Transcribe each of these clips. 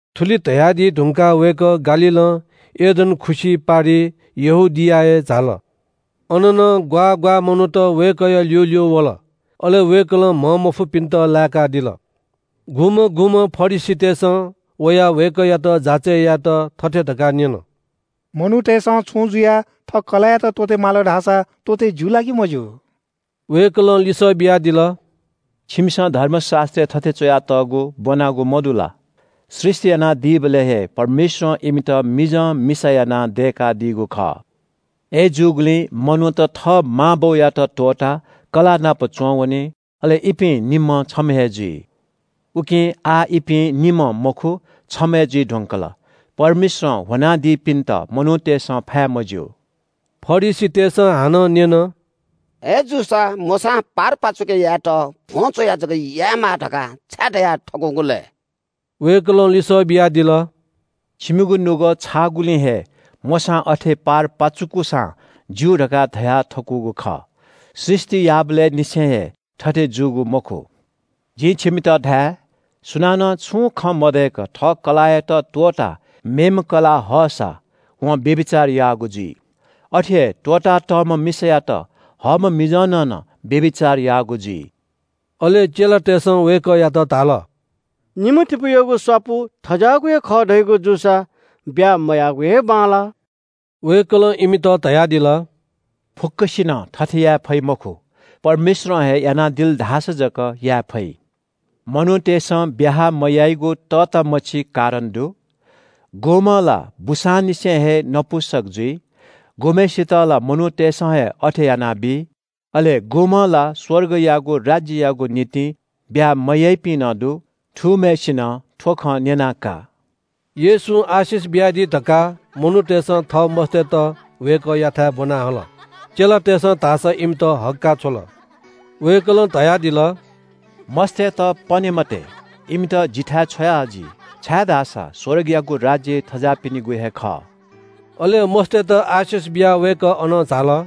थुलि धयादी धुंकाः वय्‌कः गालीलं यर्दन खुसि पारिइ यहूदियाय् झाल। अन नं ग्‍वाः ग्‍वाः मनूत वय्‌कःया ल्‍यूल्‍यू वल। अले वय्‌कलं म्‍हंमफुपिन्‍त लाय्‌कादिल। सुं फरिसीत वयाः वय्‌कःयात जाँचय् यायेत थथे धकाः न्‍यन – “मनूतय्‌सं छुं जुयाः थः कलाःयात त्‍वःते माल धाःसा त्‍वःते ज्‍यू ला कि मज्‍यू?” वय्‌कलं लिसः बियादिल – “छिमिसं धर्मशास्‍त्रय् थथे च्‍वयातःगु ब्‍वनागु मदु ला? ‘सृष्‍टि यानादीबलय् हे परमेश्‍वरं इमित मिजं मिसा यानाः दय्‌कादीगु खः’– अय्‌जूगुलिं मनूत थः मां बौयात त्‍वःताः कलाःनापं च्‍वंवनी। अले इपिं निम्‍हं छम्‍ह हे जुइ। उकिं आः इपिं निम्‍ह मखु, छम्‍ह हे जुइ धुंकल। परमेश्‍वरं ह्वनादीपिन्‍त मनूतय्‌सं फाये मज्‍यू।” फरिसीतय्‌सं हानं न्‍यन – “अय्‌जूसा मोशां पारपाचुके यायेत भ्‍वं च्‍वयाः जक यायेमाः धकाः छाय् धयाथकूगु लय्?” वय्‌कलं लिसः बियादिल – “छिमिगु नुगः छाःगुलिं हे मोशां अथे पारपाचुकूसां ज्‍यू धकाः धयाथकूगु खः। सृष्‍टि याःबलय् निसें हे थथे जूगु मखु। जिं छिमित धाये – सुनानं छुं खँ मदय्‌क थः कलाःयात त्‍वःताः मेम्‍ह कलाः हःसा वं व्‍यभिचार याःगु जुइ। अथे हे त्‍वःतातःम्‍ह मिसायात हःम्‍ह मिजंनं नं व्‍यभिचार याःगु जुइ।” अले चेलातय्‌सं वय्‌कःयात धाल – “निम्‍हतिपूयागु स्‍वापु थज्‍याःगु हे खः धयागु जूसा ब्‍याहा मयायेगु हे बांलाः।” वय्‌कलं इमित धयादिल – “फुक्‍कसिनं थथे याये फइ मखु, परमेश्‍वरं हे यानादिल धाःसा जक याये फइ। मनूतय्‌सं ब्‍याहा मयाइगु तःतामछि कारण दु। गुम्‍हं ला बूसांनिसें हे नपुंसक जुइ, गुम्‍हय्‌सित ला मनूतय्‌सं हे अथे यानाबी। अले गुम्‍हं ला स्‍वर्गयागु राज्‍ययागु निंतिं ब्‍याहा मयाइपिं नं दु। थूम्‍हय्‌सिनं थ्‍व खँ न्‍यना का।” येशूं आशिष बियाः प्रार्थना यानादी धकाः मनूतय्‌सं थः मस्‍तय्‌त वय्‌कःयाथाय् ब्‍वना हल। चेलातय्‌सं धाःसा इमित हक्‍काः छ्वल। वय्‌कलं धयादिल – “मस्‍तय्‌त पने मते। इमित जिथाय् छ्वया हजि, छाय्‌धाःसा स्‍वर्गयागु राज्‍य थज्‍याःपिनिगु हे खः।” अले मस्‍तय्‌त आशिष बियाः वय्‌कः अनं झाल।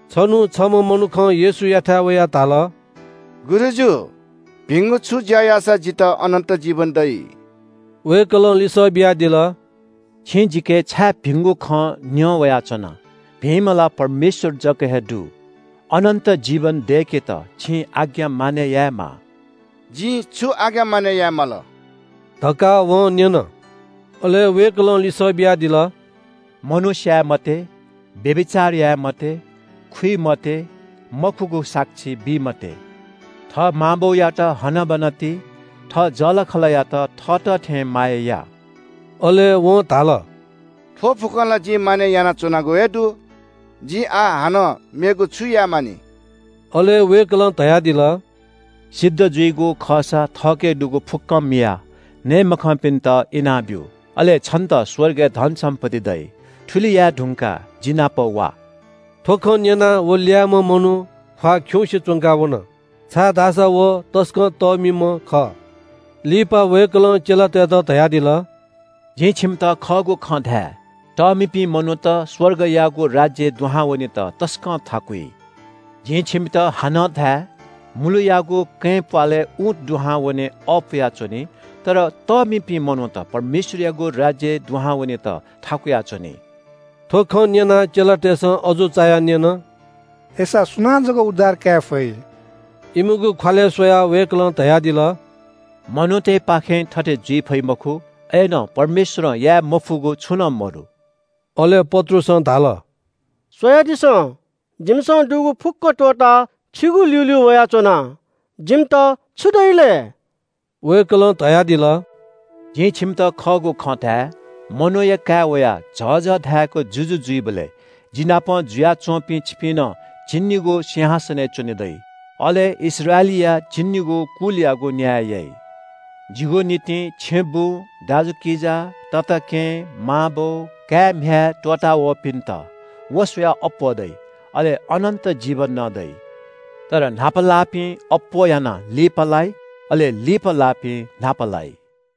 छन्‍हु छम्‍ह मनुखं येशूयाथाय् वयाः धाल – “गुरुजु, भिंगु छु ज्‍या याःसा जितः अनन्‍त जीवन दइ?” वय्‌कलं लिसः बियादिल – “छिं जिके छाय् भिंगु खँ न्‍यं वयाच्‍वना? भिंम्‍ह ला परमेश्‍वर जक हे दु। अनन्‍त जीवन दय्‌केत छिं आज्ञा मानय् यायेमाः।” “जिं छु आज्ञा मानय् याये माल?” धकाः वं न्‍यन। अले वय्‌कलं लिसः बियादिल – “मनू स्‍याये मते, व्‍यभिचार याये मते, खुइ मते, मखुगु साक्षी बी मते, थः मां बौयात हनाबना ति, थः जःलाखःलायात थःत थें माया या।” अले वं धाल – “थ्‍व फुक्‍कं ला जिं मानय् यानाच्‍वनागु हे दु। जिं आः हानं मेगु छु याये मानि?” अले वय्‌कलं धयादिल – “सिद्ध जुइगु खःसा वनाः थःके दुगु फुक्‍कं मियाः नये मखंपिन्‍त इनाब्‍यु। अले छन्‍त स्‍वर्गय् धनसम्‍पत्ति दइ। थुलि याये धुंकाः जिनापं वा।” थ्‍व खँ न्‍यनाः व ल्‍याय्‌म्‍ह मनू ख्‍वाः खिउँसे च्‍वंकाः वन, छाय्‌धाःसा व तसकं तःमिम्‍ह खः। लिपा वय्‌कलं चेलातय्‌त धयादिल – “जिं छिमित खःगु खँ धाये – तःमिपिं मनूत स्‍वर्गयागु राज्‍यय् दुहां वनेत तसकं थाकुइ। जिं छिमित हानं धाये – मुलुयागु कँय् प्‍वालय् ऊँट दुहां वने अःपुया च्‍वनी तर तःमिपिं मनूत परमेश्‍वरयागु राज्‍यय् दुहां वनेत थाकुया च्‍वनी।” थ्‍व खँ न्‍यनाः चेलातय्‌सं अजू चायाः न्‍यन – “अय्‌सा सुनां जक उद्धार काये फइ?” इमिगु ख्‍वालय् स्‍वयाः वय्‌कलं धयादिल – “मनूतय्‌पाखें थथे जुइ फइ मखु, अय्‌नं परमेश्‍वरं याये मफुगु छुं नं मदु।” अले पत्रुसं धाल – “स्‍वयादिसँ, जिमिसं दुगु फुक्‍क त्‍वःताः छिगु ल्‍यूल्‍यू वयाच्‍वना। जिमित छु दइ लय्?” वय्‌कलं धयादिल – “जिं छिमित खःगु खँ धाये – मनूया काय् वयाः झःझः धाय्‌क जुजु जुइबलय् जिनापं जुयाच्‍वंपिं छिपिं नं झिंनिगू सिंहासनय् च्‍वने दइ। अले इस्राएलीया झिंनिगू कुलयागु न्‍याय याइ। जिगु निंतिं छेँबुँ, दाजुकिजा, तताकेहेँ, मांबौ, काय्‌म्‍ह्याय् त्‍वःतावःपिन्‍त व स्‍वयाः अप्‍वः दइ। अले अनन्‍त जीवन नं दइ। तर न्‍हापा लाःपिं अप्‍वः यानाः लिपालाइ, अले लिपा लाःपिं न्‍हापा लाइ।”